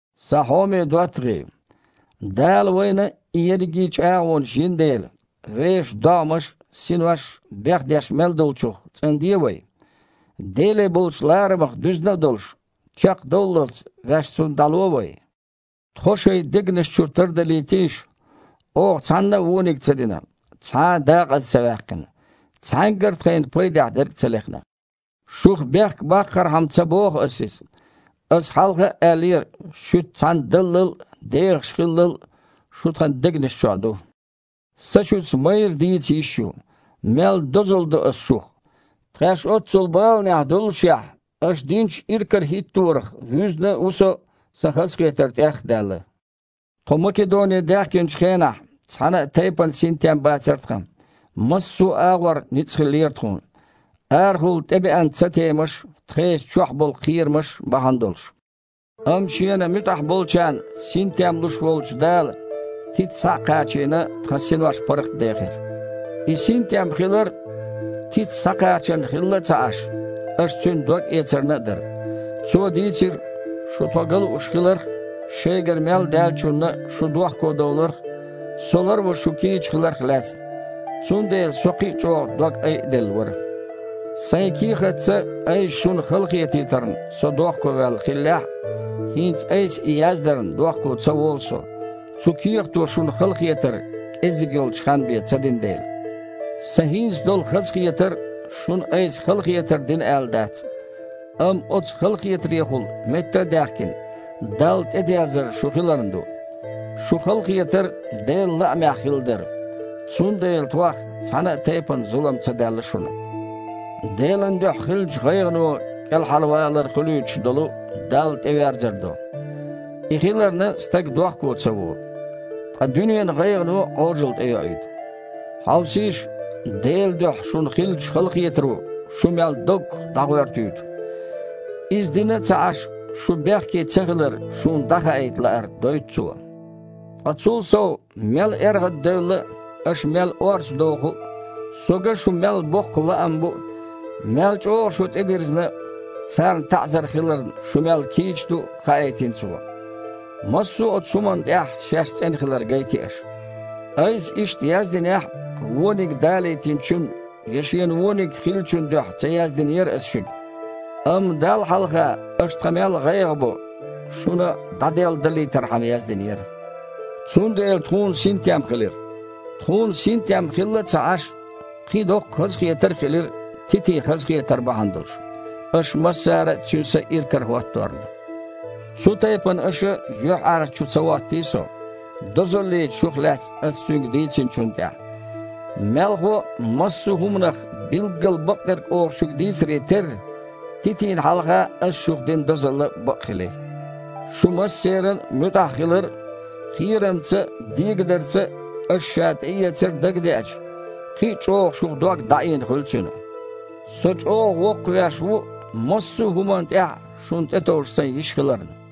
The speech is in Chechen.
Сан хьоме доттагІий! Дала вайна и ерриге а чІагІонаш йина дела, вешан догІмаш а, синош а бехдеш мел долчух цІанде вай. Деле болчу ларамах дуьзна а долуш, чекхдовллалц ваьш Цунна дІало вай. Тхо шайн дегнаш чу тардалийтийша! Оха цхьанна а вониг ца дина, цхьа а дакъаза ца ваьккхина, цхьаьнггара а тхайна пайдехь дерг а ца лехна. Шух бехк баккхархьама ца боху аса иза. Аса хьалха а аьллера, шуьца цхьаьна даллал а, дехаш хиллал а шу тхан дегнаш чохь ду. Сан шуьца майра дийца йиш ю. Мел дозалла до аса шух. Тхаьш оццул баланехь доллушехь, аша динчу иракарахІитторах вуьзна а ву со, сан хазахетар тІех а даьлла. Тхо Македоне даьхкинчу хенахь, цхьана а тайпана синтем бацара тхан. Массо а агІор ницкъ хиллера тхуна, арахула тІебеана цатемаш а, тхешан чохь болу кхерамаш а бахьана долуш. Амма Шена муьтІахь болчарна синтем луш волчу Дала, Тита схьа а кхачийна, тхан синош паргІатдехира. И синтем хилар, Тита схьакхачарна хилла а ца Іаш, аша цуьнан догъэцарна а дара. Цо дийцира, шу тхо ган лууш хиларх а, шайгара мел даьллачунна шу дохкодовларх а, со ларван шу кийча хиларх а лаьцна. Цундела со кхин а чІогІа дог айаделла вара. Сайн кехатца айса шуна халахетийтарна со дохковаьлла хиллехь а, хІинца айса и яздарна дохко ца волу со, цу кехато шуна халахетар кІеззиг йолчу ханна бен ца дина дела. Сан хІинца долу хазахетар шуна айса халахетар дина аьлла дац, амма оцу халахетарехула, метта а даьхкина, Далла тІедерзар шун хиларна ду. Шун халахетар Делан лаамехь хилла дара, цундела тхох цхьана а тайпана зулам ца даьлла шуна. Делан дуьхьа хиллачу гІайгІано кІелхьарвалар хуьлуьйтуш долу Далла тІеверзар до – и хиларна, стаг дохко ца волу. Ткъа дуьненан гІайгІано Іожалла тІейоуьйту. Хьовсийша, Делан дуьхьа шуна хиллачу халахетаро шу мел доггах дІагІоьртуьйту. Иза дина а ца Іаш, шу бехке цахилар шуна дІахаийта лаар дойту цо. Ткъа, цул сов, мел эргІаддевлла а, аша мел орца доху а, со ган шун мел боккха лаам бу а, мел чІогІа шу тІедирзина а, царна таІзар хиларна шу мел кийча ду а хаийтина цо. Массо а оцу хІуманна тІехь шаьш цІена хилар гайти аша. Айса иштта яздинехь а, вониг далийтинчун я шена вониг хиллачун дуьхьа ца яздинера аса шуьга, амма Далла хьалха аша тхан мел гІайгІа бо шуна дІаделладалийтархьама яздинера. Цундела тхуна синтем хилира. Тхуна, синтем хилла а ца Іаш, кхин а доккха хазахетар хилира Титин хазахетар бахьана долуш, аша массара а цуьнан са иракарахІотторна. Цу тайпана аша юьхьІаьржачу ца хІоттий со, дозаллица шух лаьцна аса цуьнга дийцинчунна тІехь. Мелхо а, массо а хІуманах билггал бакъдерг оха шуьга дийцаре терра, Титина хьалха аса шух дина дозалла бакъ хили. Шун массеран а муьтІахь хилар а, кхерамца а, дегадарца а аша ша тІеэцар а дагадеача, кхин а чІогІа шух дог дІаийна хуьлу цуьнан. Со чІогІа воккхавеш ву, массо а хІуманна тІехь а шуна тІетовжа сайн йиш хиларна!